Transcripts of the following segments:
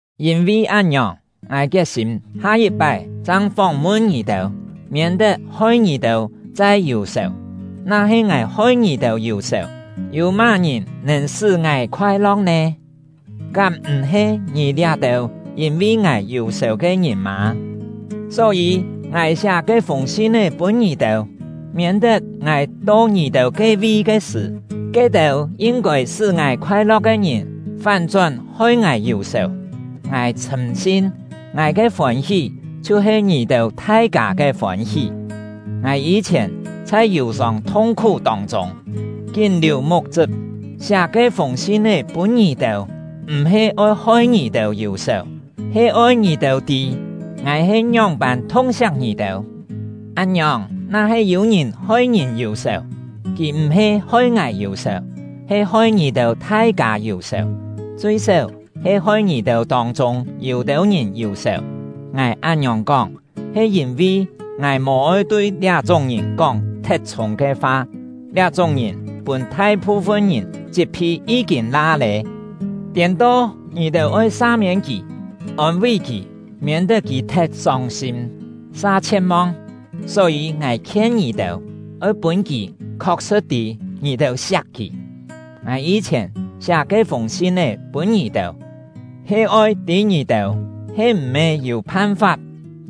Yîn-vi án-ngiòng, ngài kiet-sîm ha-yit-pái chang fóng-mun ngì-têu, miên-tet hoi ngì-têu chai yù-sèu. Na-he ngài hoi ngì-têu yù-sèu, yû má-ngìn nèn sṳ́ ngài khoai-lo̍k nè? Kám m̀-he ngì liá-têu yîn-vi ngài yù-sèu ke ngìn mâ? Só-yî, ngài siá ke-fûng sin-é pûn ngì-têu, miên-tet ngài to ngì-têu ke-vi ke sṳ̀, ke-têu yin-kôi sṳ́ ngài khoai-lo̍k ke ngìn fán-chón hoi ngài yù-sèu. Ngài chhṳ̂m-sin, ngài ke fôn-hí chhiu he ngì-têu thai-kâ ke fôn-hí. Ngài yî-chhièn chhai yù-sông thung-khú tông-chûng, kín liù muk-chṳp, siá ke-fûng sin-é pûn ngì-têu, m̀-he oi hoi ngì-têu yù-sèu, he oi ngì-têu tî ngài he ngióng-pân thung-siak ngì-têu! Án-ngiòng, na-he yû-ngìn hoi ngìn yù-sèu, kì m̀-he hoi ngài yù-sèu, he hoi ngì-têu thai-kâ yù-sèu, chui-séu he hoi ngì-têu tông-chûng yû-têu ngìn yù-sèu. Ngài án-ngiòng kóng, he yîn-vi ngài mò-oi tui liá-chúng ngìn kóng thet chhûng ke fa. Liá-chúng ngìn pûn thai-phu-fun ngìn chit-phi yí-kîn la lé. Tiên-to, ngì-têu oi sa-miên kì, ôn-ví kì, miên-tet kì thet sông-sîm sa chhie̍t-mong. Só-yî, ngài khien ngì-têu, oi pûn kì khok-sṳ̍t tî ngì-têu siak kì. Ngài yî-chhièn siá ke-fûng sin-é pûn ngì-têu, he oi tî ngì-têu he m̀-he yû phan-fap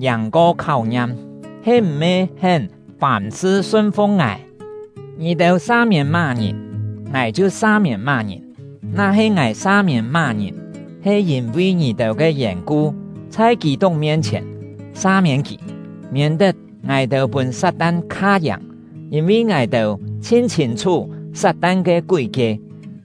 yàng-ko kháu-ngiam, he m̀-he hén fàm-sṳ sun-fu̍k ngài. Ngì-têu sa-miên má-ngìn, ngài chhiu sa-miên má-ngìn. Na-he ngài sa-miên má-ngìn, he yîn-vi ngì-têu ke yèn-ku chhai Kî-tuk mien-chhièn sa-miên kì, miên-tet ngài-têu pûn Sat-tan kha-yàng, yîn-vi ngài-têu chhin chhîn-chhú Sat-tan ke kúi-kie.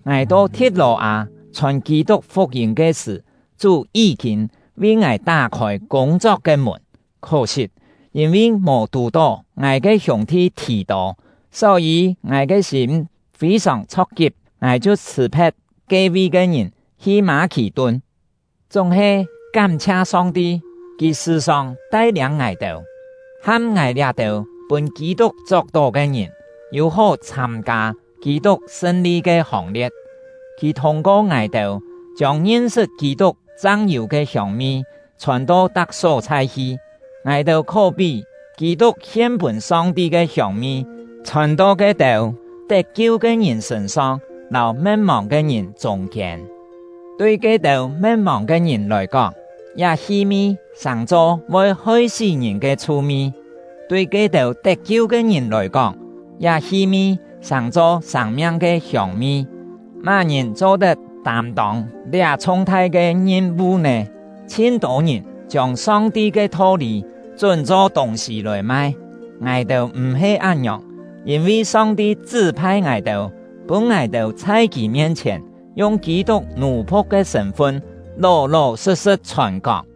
Ngài to Thi̍t-lò-â chhòn Kî-tuk fuk-yîm ke sṳ̀, Chú yí-kîn vi ngài tá-khôi kûng-chok ke mùn. Khó-sit, yîn-vi mò tù-tó ngài ke hiûng-thi Thì-tô, só-yî ngài ke sîm fî-sòng chho̍k-kip; ngài chhiu chhṳ̀-phe̍t ke-vi ke ngìn, hi Mâ-khì-tun. Chúng-he, kám-chhia Song-ti! Kì sṳ̀-sòng tai-liâng ngài-têu, ham ngài liá-têu pûn Kî-tuk chok-tó ke ngìn yû-hó chhâm-kâ Kî-tuk sṳn-li ke hòng-lie̍t. Kì thûng-ko ngài-têu chiông ngin-sṳt Kî-tuk chang yû ke hiông-mi chhòn-to tak só-chhai hi. Ngài-têu khó-pí Kî-tuk hien-pûn Song-ti ke hiông-mi, chhòn-to ke-têu tet-kiu ke ngìn sṳ̂n-song lâu me̍t-mòng ke ngìn chûng-kiên. Tui ke-têu me̍t-mòng ke ngìn lòi kóng, liá hi-mi sàng-cho voi hoi-sí ngìn ke chhu-mi; tui ke-têu tet-kiu ke ngìn lòi kóng, liá hi-mi sàng-cho sâng-miang ke hiông-mi. Má-ngìn cho-tet tâm-tông liá chhung-thai ke ngim-vu nè? Chhin-tô ngìn chiông Song-ti ke tho-lî chún-cho tûng-sî lòi mai; ngài-têu m̀-he án-ngiòng, yîn-vi Song-ti chṳ́-phai ngài-têu, pûn ngài-têu chhai Kì mien-chhièn, yung Kî-tuk nù-phu̍k ke sṳ̂n-fun, ló-ló sṳ̍t-sṳ̍t chhòn-kóng.